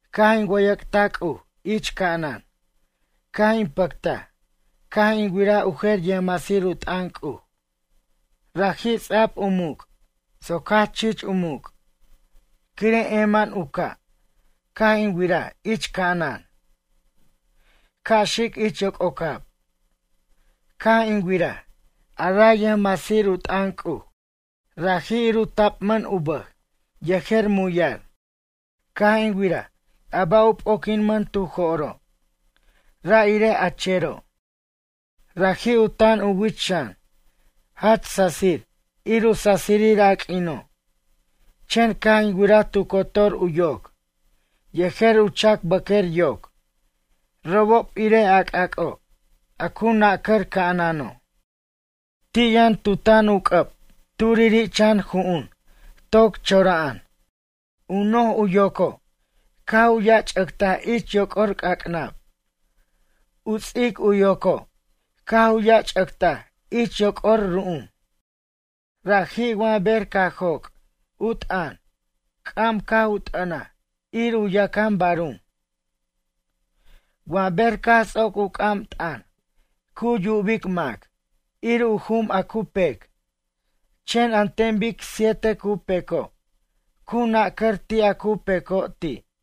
Caj in wʌyʌc'taj C'uj ich ca'anan, caj in pʌctaj caj in wiraj u jer yʌjmasir u t'ʌn C'uj. Raji' ts'a'b u muc' soc jach chich u muc', quire' eman u ca' caj in wiraj ich ca'anan ca' xic ich yoc'ocab. Caj in wiraj a ray yʌjmasir u t'ʌn C'uj, raji' ir u tapmʌn u bʌj yejer muyar. Caj in wiraj a ba' p'oquinmʌn tu jo'ro', ra' irej a chero'. Raji' u tan u wich xan, jach sasir ir u sasirir a q'uino', chen caj in wiraj tu cotor u yoc yejer u chac bʌq'uer yoc robob irej a c'ac'o' a cu nacʌr ca'anano'. Ti' yʌn tu tan u c'ʌb turiri' chan ju'un toc chora'an. U noj u yoco' caj u yach'ʌctaj ich yoc'or c'ac'nab. U ts'ic u yoco' caj u yach'ʌctaj ich yoc'or ru'um. Raji' wa ber caj joc' u t'ʌn, c'am caj u t'ʌnaj ir u yacan barum. Wa ber caj ts'oc u c'am t'ʌn, cu yubic mac ir u jum a cu pec, chen an ten bic siete cu peco' cu nunca'r ti' a cu peco' ti'.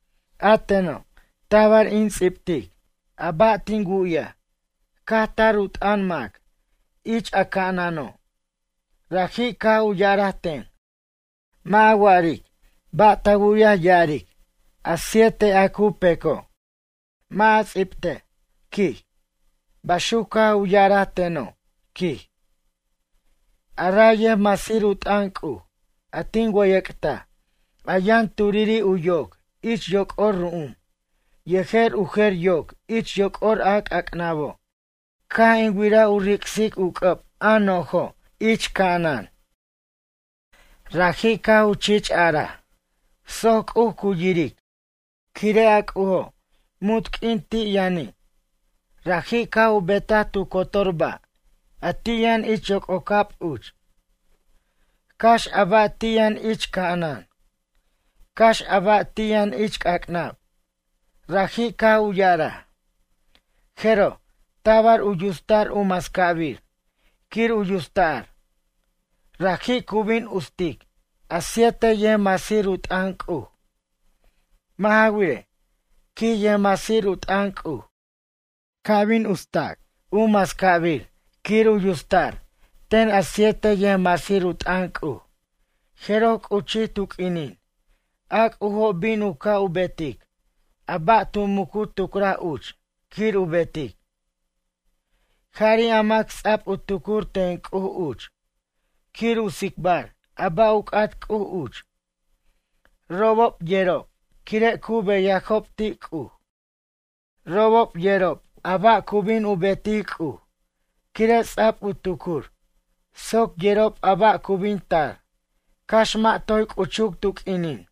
A teno', tabar in ts'ibtic a ba' tin wu'yaj caj tar u t'ʌn mac ich a ca'anano', raji' caj u ya'araj ten: ―Mʌ' a wa'aric ba' ta wu'yaj ya'aric a siete a cu peco'. Mʌ' a ts'ibej ―quij, baxuc caj u ya'araj teno', quij. A ray yʌjmasir u t'ʌn C'uj a tin wʌyʌc'taj, a yʌn turiri' u yoc ich yoc'or ru'um yejer u jer u yoc ich yoc'or a cac'nabo', caj in wiraj u ric'sic u c'ʌb a nojo' ich ca'anan. Raji' caj u chich araj soc C'uj cu yiric, quire' a C'ujo' munt q'uin ti' yʌni', raji' caj u betaj tu cotor ba' a ti' yʌn ich yoc'ocab uch, cax a ba' ti' yʌn ich ca'anan, cax a ba' ti' yʌn ich c'ac'nab. Raji' caj u ya'araj: ―Jeroj tabar u yutsta'r u mascabir quir u yutsta'r. Raji' cu bin ustic, a siete yʌjmasir u t'ʌn C'uj. Mʌ' ja wirej ―quij yʌjmasir u t'ʌn C'uj―, ca' bin yutstac u mascabir quir u yutsta'r ten a siete yʌjmasir u t'ʌn C'uj, jeroj c'uchij tu q'uinin a C'ujo' bin u ca' u betic a ba' tu mucu tucraj uch quir u betic. Jari' a mac ts'a'b u tucur ten C'uj uch quir u tsicbar a ba' u c'at C'uj uch robob yerob quire' cu beyajob ti' C'uj. Robob yerob a ba' cu bin u betic C'uj quire' ts'a'b u tucur soc yerob a ba' cu bin tar cax mʌ' toy c'uchuc tu q'uinin.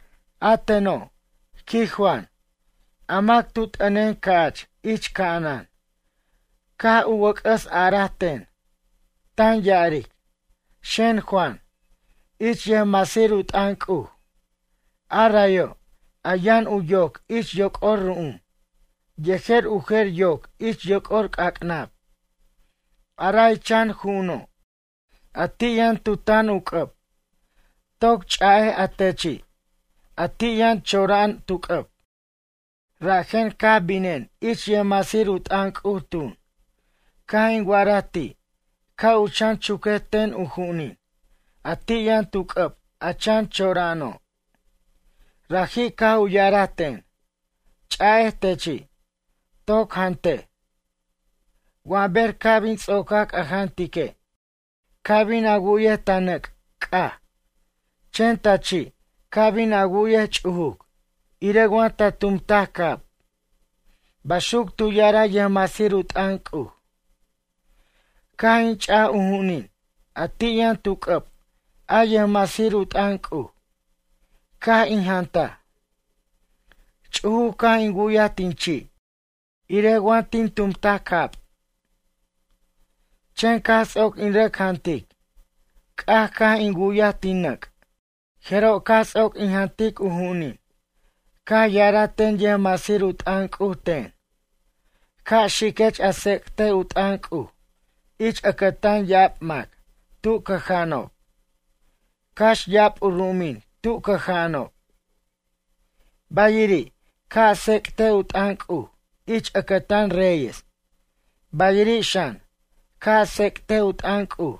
A teno', quij Juan, a mac a tu t'ʌnen ca'ch ich ca'anan caj u wʌc'ʌs araj ten, tan ya'aric: ―Xen, Juan, ich yʌjmasir u t'ʌn C'uj, a rayo', a yʌn u yoc ich yoc'or ru'um, yejer u jer u yoc ich yoc'or c'ac'nab. A ray chan ju'uno', a ti' yʌn tu tan u c'ʌb, toc ch'a'ej a techi', a ti' yʌn chora'an tu c'ʌb. Rajen caj binen ich yʌjmasir u t'ʌn C'uj tun, caj in wa'araj ti' ca' u chan chuquej ten u ju'unin a ti' yʌn tu c'ʌb a chan chora'ano'. Raji' caj u ya'araj ten: ―Ch'a'ej techi', toc jantej. Wa ber ca' bin ts'ocac a jantique', ca bin a wu'yej ta nʌc' c'aj, chen ta chi' ca bin a wu'yej ch'ujuc irej wa ta tumtaj cab ―baxuc tu ya'araj yʌjmasir u t'ʌn C'uj. Caj in ch'aj u ju'unin a ti' yʌn tu c'ʌb a yʌjmasir u t'ʌn C'uj, caj in jantaj. Ch'ujuc caj in wu'yaj tin chi' irej wa tin tumtaj cab. Chen caj ts'oc in rʌc jantic, c'aj caj in wu'yaj tin nʌc'. Jeroj caj ts'oc in jantic u ju'unin, caj ya'araj ten yʌjmasir u t'ʌn C'uj ten: ―Ca' xiquech a tsec't u t'ʌn C'uj ich ʌcʌtan ya'ab mac tu cʌja'anob, cax ya'ab u ru'umin tu cʌja'anob. Bayiri', ca' a tsec't u t'ʌn C'uj ich ʌcʌtan reyes, bayiri' xan, ca' a tsec't u t'ʌn C'uj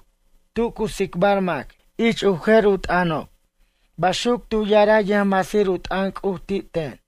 tu cu tsicbar mac ich u jer u t'ʌnob ―baxuc tu ya'araj yʌjmasir u t'ʌn C'uj ti' ten.